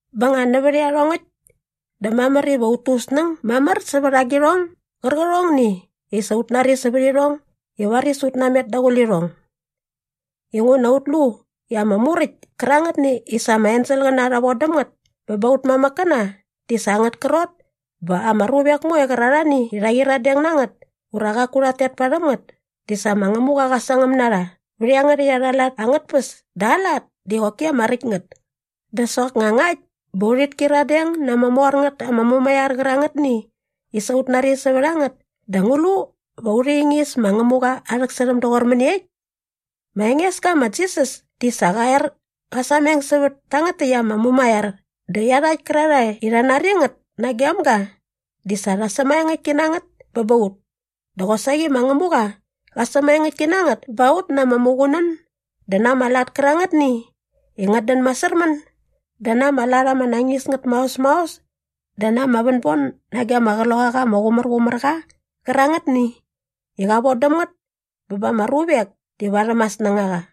Bä nga nävät iarhongäkt dä mamär iva ut tu ut snäng mamär sävät agirhong gärqärhongni i sa ut nari sävät irhong i varis ut namet daqule irhong. Inguna ut lu i ama Muräkt kärangätni i sa ama enselqäna rha von däm ngät bä ba aut mamäkkäna di sa angät krot bä ama ruvek moe qärarhani i rha qyiradeng na ngät ura qaku rhat tet parhäm ngät di sa ma Ngämuqa qa sangäm na rha vät iangärhäkt arha lat angät tpäs dä aa lat di qoki ama räkt ngät. Dä soknga ngakt bä urhit kyiradeng na ama mor ngät ama mumaiar qärangätni i sa ut nari sävät a ngät dä ngu lu va urhi ingis ma Ngämuqa aa rhäksärhäm doqor mäniekt? Ma Engeska ma Jisas di sa qa er qa sameng sävät tangät takt ama mumaiar dä iarhakt kärarhae i rha nari ngät nagem ga di sa rha sämaengäktki na ngät bä ba ut. Dä qosaqi ma Ngämuqa qa sämaengäktki na ngät ba ut na ama muqunän dä na ama lat kärangätni i ngät dän masärmän dä na ama lat ama nañis ngät maos maos dä na ama vänbon nage ama Qloqaqa ama Qumärqumärqa qärangätni i qa von däm ngät bä ba ama ruvek di varhäm aa snängaqa.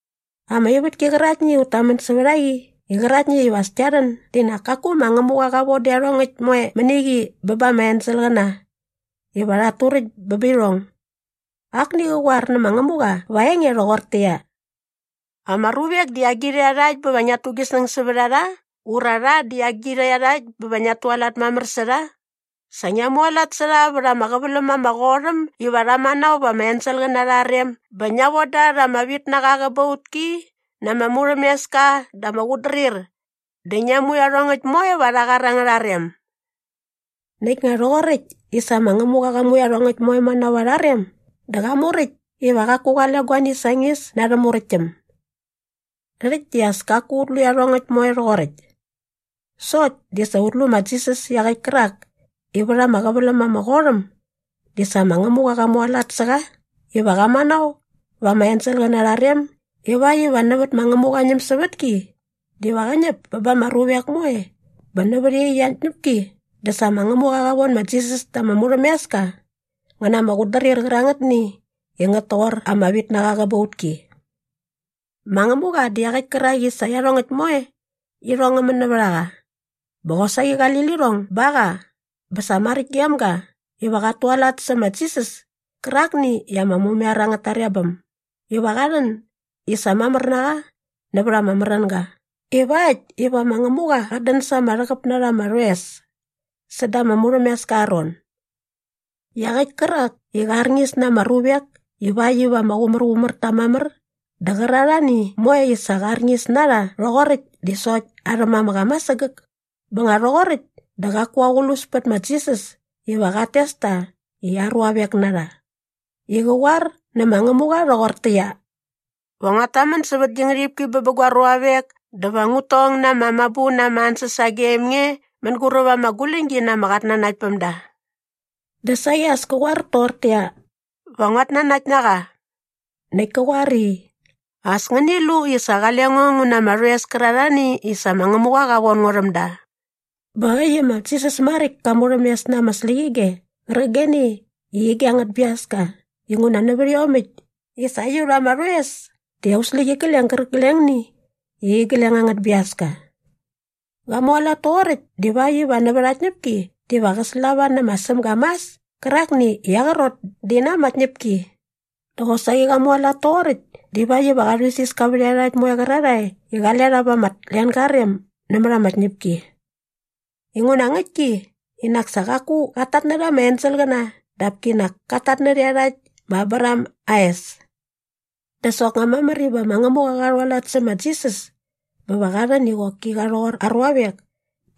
Ama ivätki qäraktni i ut tamän sävät a qi qäraktni iva as kia rhän di nak kaku ma Ngämuqa qa von dä iarhongäkt moe mäni qi bä ba ama enselqäna iva rhat turäkt bä bä irhong. Akni qa qoar nä ma Ngämuqa va aa enge rhoqortäqyia, “Ama ruvek di agirha iarhakt bä va ngiat tu gi snäng sävät a rha ura rha di agirha iarhakt bä va ngiat tualat mamär sä rha? Sa ngia mualat sä rha vät ama qäväläm ama qot äm iva rha manao va ama enselqäna arha rem bä ngia von da rha ama vitnaqa aa qäbautki na ama murhämeska dä ama qutdrir dä ngia mu iarhongäkt moe va arha qar angärha rem.” Näkt nga rhoqoräkt i sa ma Ngämuqa qa mu iarhongäkt moe manao va arha rem dä qa muräkt iva qaku qale guani sañis na arhä muräktäm. Rhäkt di as kaku ut lu iarhongäkt moe rhoqoräkt. Sokt di sa ut lu ma Jisas iaqäkt kärak i vät ama qäväläm ama qot äm di sa ma Ngämuqa qa mualat sä qa iva qa manao va ama enselqäna arha rem ivakt iva nävät ma Ngämuqa aa ñämsävätki diva qä ñäp bä ba ama ruvek moe bä nävät iaqyäkt aa tñäpki dä sa ma Ngämuqa qa von ma Jisas ta ama murhämeska ngä na ama qutdrir qärangätni i ngät toqor ama vitnaqa aa qäbautki. Ma Ngämuqa di iaqäkt kärak i sa iarhongäkt moe irhong ngä män nävät a qa bä qosaqi qali lirhong ba qa bä sa maräkt gem ga iva qat tualat sä ma Jisas kärakni i ama mumaiar angät tarebäm iva qa rhän i sa mamär na qa nävät ama märänga ivakt iva ma Ngämuqa qat dän sa ama rhäqäp na rha ama rhoes säda ama murhämeska aa ron. Iaqäkt kärak i qä rharñis na ama ruvek ivakt iva ama qumärqumär ta mamär dä qärarhani moe i sa qa arñis na rha rhoqoräkt di sokt arhä mamäk ama sägäk. Bä nga rhoqoräkt dä qaku aqlus pät ma Jisas iva qat tes ta i aa ruavek na rha i qä qoar nä ma Ngämuqa rhoqortäqyia, “Va nguat tamän sävät gi ngärhipki bä bä gua ruavek dä va ngut tong na ama mabu na ama ansäs sagem nge mänguräp ama guläñgi na ama qatnanaktpämda.” Dä saqi as kä qoar toqortäqyia, “Va nguat nanakt na qa.” Näkt ka qoar i, “As ngäni lu i sa qale ngo ngu na ama rhoes kärarhani i sa ma Ngämuqa qa von ngo rhäm da.” Bä äkt i ma Jisas maräkt ka murhämes na ama släqyige qärqigeni i ige angät biaska inguna nävät iomäkt i sa aiut ama rhoes di aut släqyigleng gärqiglengni i igleng angät biaska. Qa mualat toqoräkt divakt iva nävät aa tñäpki diva qä slava nä ma Sämga mas kärakni i aa qrot di na ama tñäpki. Dä qosaqi qa mualat toqoräkt divakt iva qa rhuisiska vät iarhakt moe qärarhae i qale rha va ama tlenga aa rem nämät ama tñäpki. Inguna ngäktki i nak sa qaku qat tatnärha ama enselqäna dap kinak kat tatnärhä iarhakt ma Abraham aa es. Dä soknga mamär iva ma Ngämuqa qa rhualat sä ma Jisas bä va qa rhän i qoki qa rhoqor aa ruavek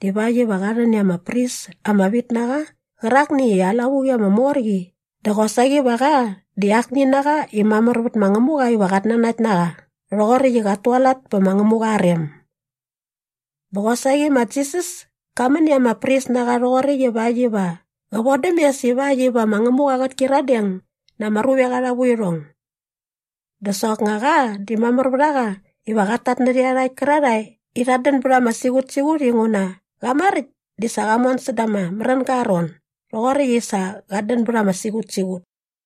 divakt iva qa rhän i ama pris ama vit na qa qärakni i aa lavuqi ama mor qi dä qosaqi va qa di akni na qa i mamär vät ma Ngämuqa iva qat nanakt na qa rhoqoräkt i qat tualat pä ma Ngämuqa aa rem. Bä qosaqi ma Jisas ka män i ama pris na qa rhoqoräkt ivakt iva qä vodäm mes ivakt iva ma Ngämuqa qät kyiradeng na ama ruvek arha vuirhong. Dä soknga qa di mamär vät a qa iva qat tatnärhä iarhakt kärarhae i rhat dän bät ama siqutsiqut inguna qa maräkt di sa qa mon säda ama märänga aa ron doqoräkt i sa qat dän bät ama siqutsiqut.